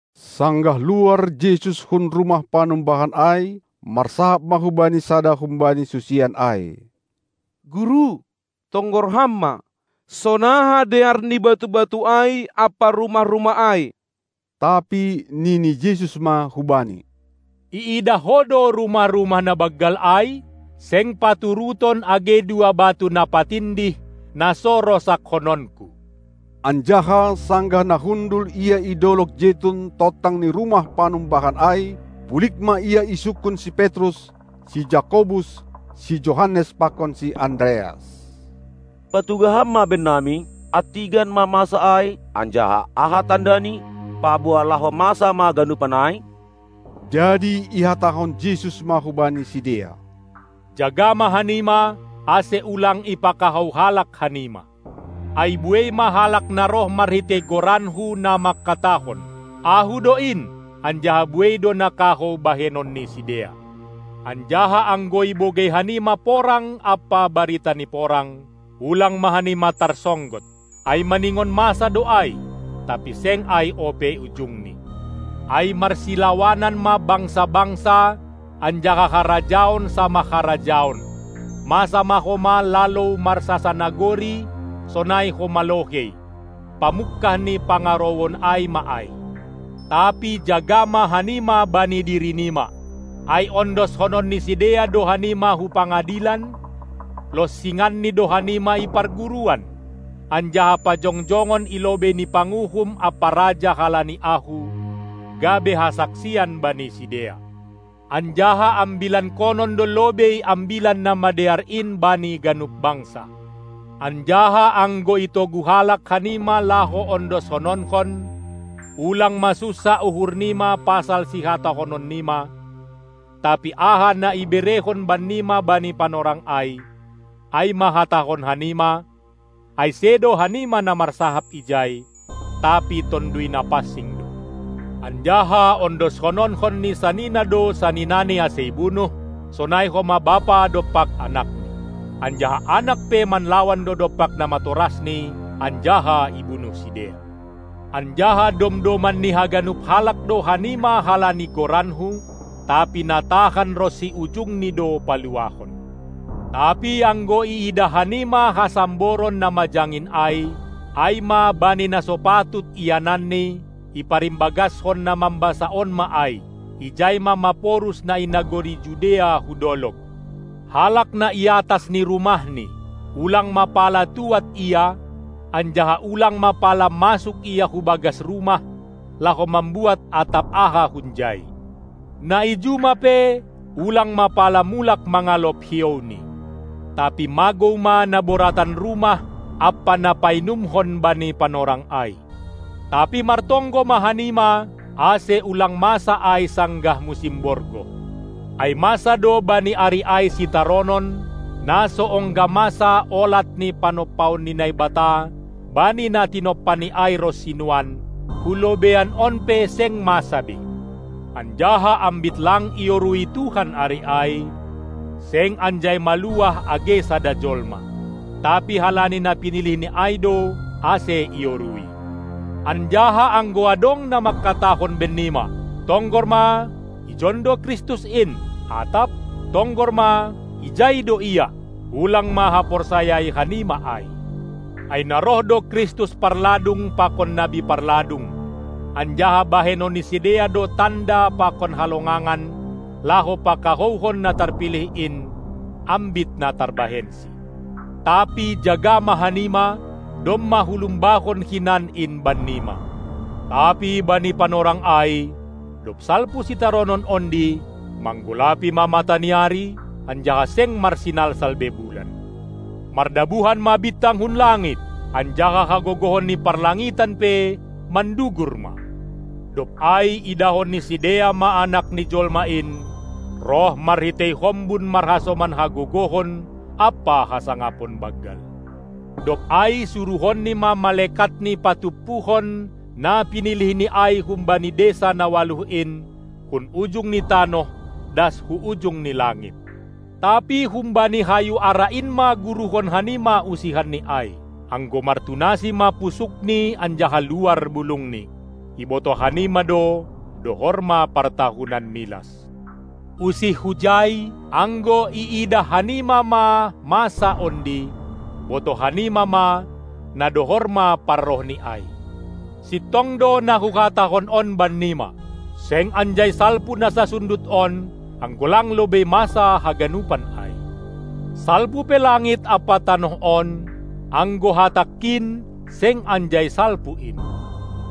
Sanggah luar Jesus hun rumah panumbahan ai, marsahap ma hu Bani sada humbani susian ai: Guru, tonggor Ham ma, sonaha dear ni batu-batu ai ampa rumah-rumah ai! Tapi nini Jesus ma hubani: Iidah ho do rumah-rumah na banggal ai? Seng paturuton age dua batu na patindih, na so rosakkononKu. Anjaha, sanggah na hundul Ia i dolog Jetun tontang ni rumah panumbahan ai, pulig ma Ia isungkun si Petrus, si Jakobus, si Johannes pakon si Andreas. Patugah Ham ma bennami, antigan ma masa ai, anjaha aha tandani, paboa laho masa ma ganupan ai? Jadi ihatahon Jesus ma hubani sidea: Jaga ma hanima, ase ulang ipakahou halak hanima. Ai buei ma halak na roh marhitei goranKu, na mangkatahon: Ahu do in! Anjaha buei do na kahou bahenon ni sidea. Anjaha anggo ibogei hanima porang ampa barita ni porang, ulang ma hanima tarsonggot! Ai maningon masa do ai, tapi seng ai ope ujungni. Ai marsilawanan ma bangsa-bangsa anjaha harajaon samah harajaon, masa ma homa lalou marsasanagori, sonai homa lohei. Pamungkah ni pangarouon ai ma ai. Tapi jaga ma hanima bani diri nima! Ai ondoskonon ni sidea do hanima hu pangadilan, longsinganni do hanima i parguruan, anjaha pajongjongon i lobei ni panguhum ampa raja halani Ahu, gabe hasaksian bani sidea. Anjaha ambilankonon do lobei Ambilan Namadear in bani ganup bangsa. Anjaha anggo itogu halak hanima laho ondoskononkon, ulang ma sunsah uhur nima pasal sihatahonon nima, tapi aha na iberehon bannima bani panorang ai, ai ma hatahon hanima, ai sedo hanima na marsahap ijai, tapi Tonduy Napansing do. Anjaha ondoskononkon ni sanina do saninani ase ibunuh, sonai homa bapa dompak anakni. Anjaha anak pe manlawan do dompak namatorasni anjaha ibunuh sidea. Anjaha domdoman ni haganup halak do hanima halani goranKu. Tapi na tahan ronsi ujungni do paluahon. Tapi anggo iidah hanima hasamboron na majangin ai, ai ma bani na so patut iananni (iparimbagaskon na mambasa on ma ai), ijai ma maporus na i nagori Judea hu dolog! Halak na i atas ni rumahni, ulang ma pala tuad ia, anjaha ulang ma pala masuk ia hu bagas rumah, laho mambuat atap aha hunjai. Na i juma pe ulang ma pala mulak mangalop hiouni. Tapi magou ma naboratan rumah ampa na painumhon bani panorang ai. Tapi martonggo ma hanima, ase ulang masa ai sanggah musim borgoh. Ai masa do bani ari ai sitaronon, na so ongga masa olat ni panompaon ni Naibata bani na tinompaNi ai ronsi nuan, hu lobeian on pe seng masa be. Anjaha ambit lang iorui Tuhan ari ai, seng anjai maluah age sada jolma. Tapi halani na pinilihni ai do, ase iorui. Anjaha anggo adong na mangkatahon bennima: "Tonggor ma, ijon do Kristus in!" atap: "Tonggor ma, ijai do Ia," ulang ma haporsayai hanima ai. Ai na roh do Kristus parladung pakon nabi parladung, anjaha bahenon ni sidea do tanda pakon halongangan laho pakahouhon na tarpilih in, ambit na tarbahensi. Tapi jaga ma hanima, domma hulumbahon hinan in bannima! Tapi bani panorang ai, dob salpu sitaronon ondi, manggolapi ma mataniari, anjaha seng marsinalsal be bulan. Mardabuhan ma bintang hun langit, anjaha hagogohon ni parlangitan pe mandugur ma. Dob ai idahon ni sidea ma Anak ni Jolma in roh marhitei hombun marhasoman hagogohon ampa hasangapon banggal. Dob ai suruhonNi ma malekatni patumpuhon na pinilihNi ai humbani desa na ualuh in, hun ujung ni tanoh das hu ujung ni langit. Tapi humbani hayu ara in ma guruhon hanima usihanni ai. Anggo martunasi ma pusukni anjaha luar bulungni, ibotoh hanima do, dohor ma partahunan milas. Usih hujai, anggo iidah hanima ma masa ondi, botoh hanima ma, na dohor ma parrohni ai. Sintong do na Huhatahon on bannima: Seng anjai salpu na sansundut on, anggo lang lobei masa haganupan ai. Salpu pe langit ampa tanoh on, anggo hatangKin seng anjai salpu in.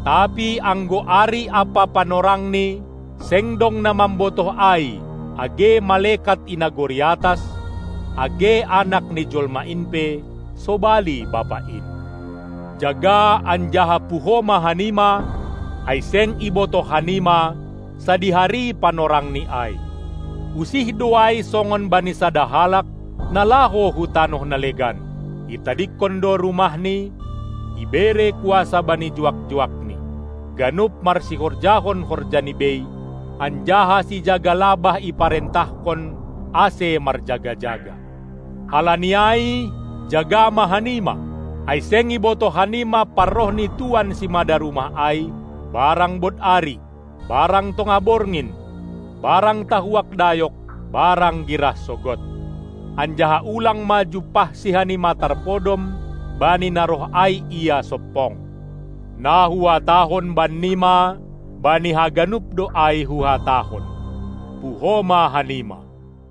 Tapi anggo ari ampa panorangni seng dong na mambotoh ai age malekat i nagori atas, age Anak ni jolma in pe, sobali Bapa in. Jaga anjaha puho ma hanima, ai seng ibotoh hanima, sadihari panorangni ai. Usih do ai songon bani sada halak, na laho hu tanoh na legan: Itadingkon do rumahni, ibere kuasa bani juak-juakni, ganup marsihorjahon horjani bei, anjaha sijaga labah iparentahkon, ase marjaga-jaga. Halani ai jaga ma hanima, ai seng ibotoh hanima parroh ni tuan simada rumah ai, barang bod ari, barang tongah borngin, barang tahuak dayok, barang girah sogod. Anjaha ulang ma jumpahSi hanima tarpodom, bani na roh ai Ia sompong. Na Huhatahon bannima, bani haganup do ai Huhatahon: Puho ma hanima!